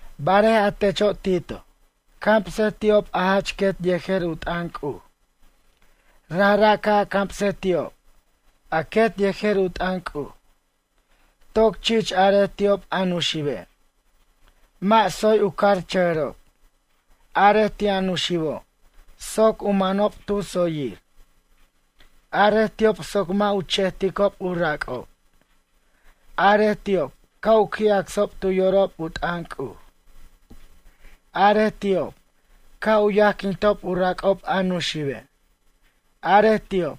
Barej a techo' Tito, Camsej ti'ob a jach quet yejer u t'ʌn C'uj. Rajra' ca' a camsej ti'ob, a quet yejer u t'ʌn C'uj. Toc chich arej ti'ob a nuxibe'. Mʌ' tsoy u carchʌjʌrob. Arej ti' a nuxibo' soc u manob tu tsoyir. Arej ti'ob soc mʌ' u chejticob u rac'ob. Arej ti'ob ca' u qui' acsob tu yorob u t'ʌn C'uj. Arej ti'ob ca' u yajquintob u rac'ob a nuxibe'. Arej ti'ob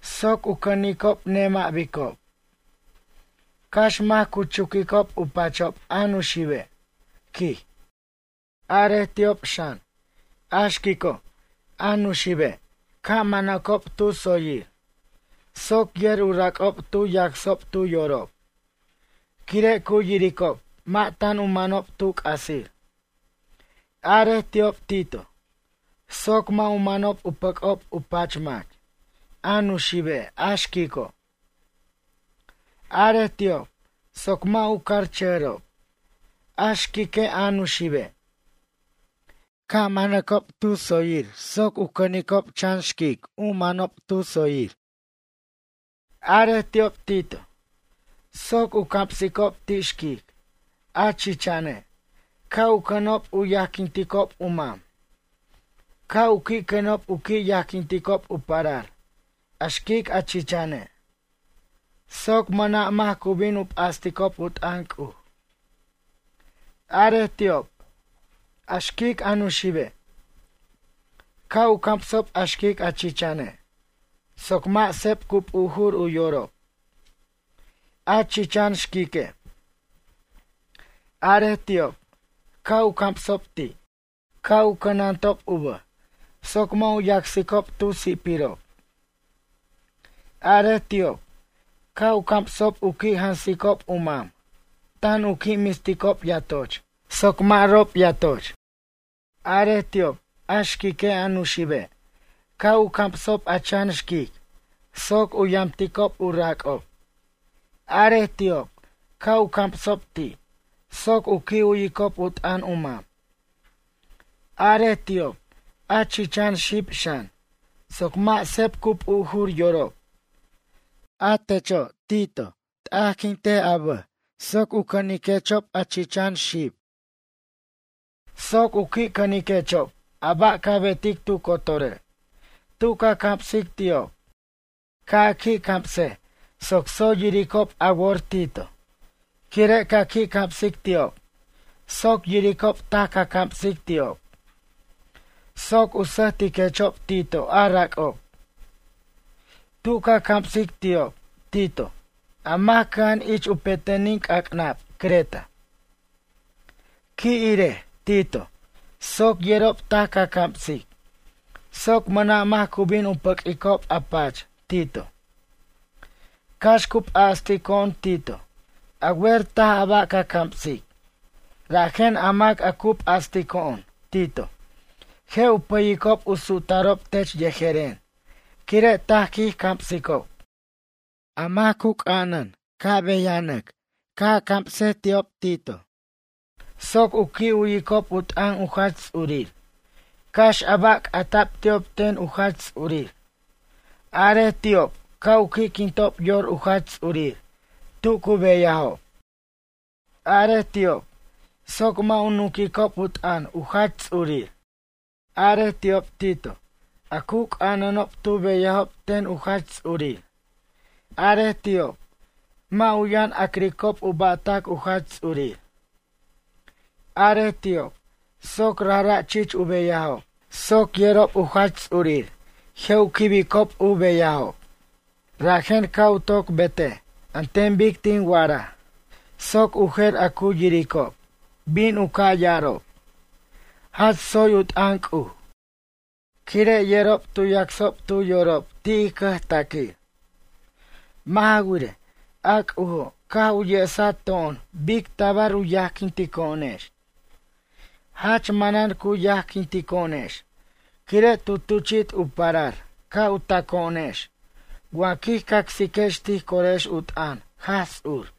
soc u cʌnicob nemʌ' bicob. Cax mac cu chuquicob u pachob a nuxibe', quij. Arej ti'ob xan, a xquico', a nuxibe' ca' manacob tu tsoyir, soc yer u rac'ob tu yacsob tu yorob. Quire' cu yiricob mʌ' tan u manob tu c'asir. Arej ti'ob Tito, soc mʌ' u manob u pʌc'ob u pach mac, a nuxibe' a xquico'. Arej ti'ob soc mʌ' u carchʌjʌrob, a xquique' a nuxibe'. Ca' manacob tu tsoyir soc u cʌnicob chan xquic, u manob tu tsoyir. Arej ti'ob Tito, soc u camsicob ti' xquic, a chichane', ca' u cʌnob u yajquinticob u mam. Ca' u qui' cʌnob u qui' yajquinticob u parar, a xquic a chichane'. Soc mʌna' mac cu bin u p'asticob u t'ʌn C'uj. Arej ti'ob, a xquic a nuxibe', ca' u camsob a xquic a chichane' soc mʌ' seb cu p'ujur u yorob, a chichan xquique'. Arej ti'ob ca' u camsob ti', ca' u cʌnantob u bʌj soc mʌ' u yacsicob tu si'pirob. Arej ti'ob ca' u camsob u qui' jansicob u mam tan u qui' misticob yatoch soc mʌ' rob yatoch. Arej ti'ob, a xquique' a nuxibe', ca' u camsob a chan xquic soc u yamticob u rac'ob. Arej ti'ob ca' u camsob ti', soc u qui' u'yicob u t'ʌn u mam. Arej ti'ob, a chichan xib xan, soc mʌ' seb cu p'ujur yorob. A techo', Tito, t'ajquint a bʌj soc u cʌniquechob a chichan xib. Soc u qui' cʌniquechob a ba' ca betic tu cotore', tu ca camsic ti'ob. Ca' a qui' camsej soc tsoy yiricob a wor Tito, quire' ca qui' camsic ti'ob soc yiricob taj ca camsic ti'ob. Soc u sʌjtiquechob Tito a rac'ob. Tu ca camsic ti'ob, Tito, a mac cʌja'an ich u petenin c'ac'nab Creta. Qui' irej, Tito, soc yerob taj ca camsic. Soc mʌna' mac cu bin u pʌq'uicob a pach, Tito. Cax cu p'astico'on Tito, a wer taj a ba' ca camsic, rajen a mac a cu p'astico'on, Tito, je' u pʌyicob u su'tarob tech yejeren, quire' taj quij camsicob. A mac cu c'anan ca' beyanʌc ca' a camsej ti'ob, Tito, soc u qui' u'yicob u t'ʌn u jach ts'urir, cax a ba' c'ata'b ti'ob ten u jach ts'urir. Arej ti'ob ca' u qui'quintob yor u jach ts'urir tu cu beyajob. Arej ti'ob soc mʌ' u nunquicob u t'ʌn u jach ts'urir. Arej ti'ob, Tito, a cu c'ananob tu beyajob ten u jach ts'urir. Arej ti'ob, mʌ' u yʌn ac'ricob u ba'tac u jach ts'urir. Arej ti'ob soc rajra' chich u beyajob soc yerob u jach ts'urir je' u quibicob u beyajob. Rajen ca' u toc betej an ten bic tin wa'araj soc u jer a cu yiricob bin u ca' ya'arob: “Jach tsoy u t'ʌn C'uj”, quire' yerob tu yacsob tu yorob ti' ij cʌjtaquir. Mʌ' ja wirej, a C'ujo' caj u yesato'on bic tabar u yajquintico'onex. Jach manan cu yajquitico'onex quire' tu tuchi't u parar ca' u taco'onex wa quij cacsiquex tij corex u t'ʌn Jaj Ts'ur.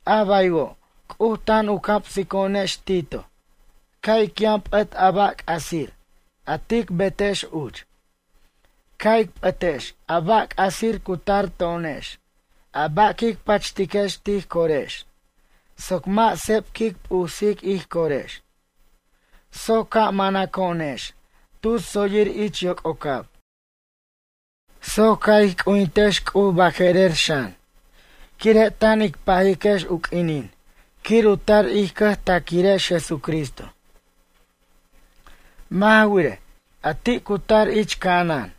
A baywo' C'uj tan u camsico'onex Tito ca' ic yʌn p'ʌt a ba' c'asir, a tic betex uch. Ca' ic p'ʌtex a ba' c'asir cu tar to'onex a ba' quic pachtiquex tij corex soc mʌ' seb quic p'usic ij corex. Soc ca' manaco'onex tu tsoyir ich yoc'ocab. Soc ca' ij qui' c'ujintex C'uj baje'rer xan. Quire' tan ic pajiquex u q'uinin quir u tar ij cʌjtaquirex Jesucristo. Mʌ' ja wirej, a ti' cu tar ich ca'anan,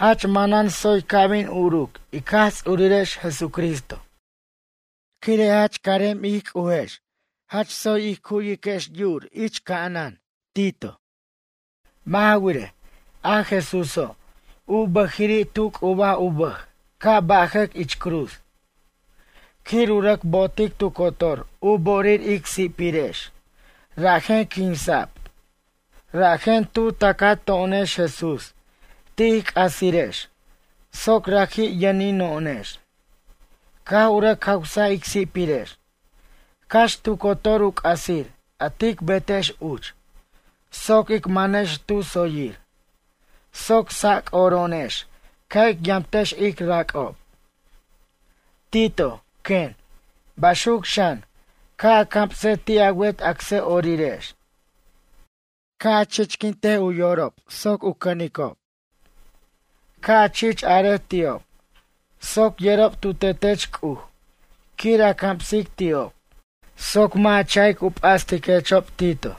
jach manan tsoy ca' bin uruc ic Jaj Ts'urirex Jesucristo. Quire' jach carem ij C'ujex jach tsoy ij cu'wiquex yur ca'anan Tito. Mʌ' ja wirej, a Jesúso', u bʌjiri' tu c'ubaj u bʌj ca' bajʌc ich cruz. Quir u rʌc bo'otic tu cotor u bo'orir ic si'pirex rajen quinsa'b. Rajen tu tacato'onex Jesús ti' ij c'asirex soc raji' yʌnino'onex. Caj u rʌc jawsaj ic si'pirex. Cax tu cotor u c'asir a tic betex uch soc ic manex tu tsoyir. Soc sac'oro'onex ca' ic yamtex ic rac'ob. Tito, quen, baxuc xan ca' a camse ti' a wet acsʌ'orirex. Ca' a chichquint u yorob soc u cʌnicob. Ca' a chich arej ti'ob soc yerob tu tetech C'uj quir a camsic ti'ob. Soc mʌ' a cha'ic u p'astiquechob, Tito.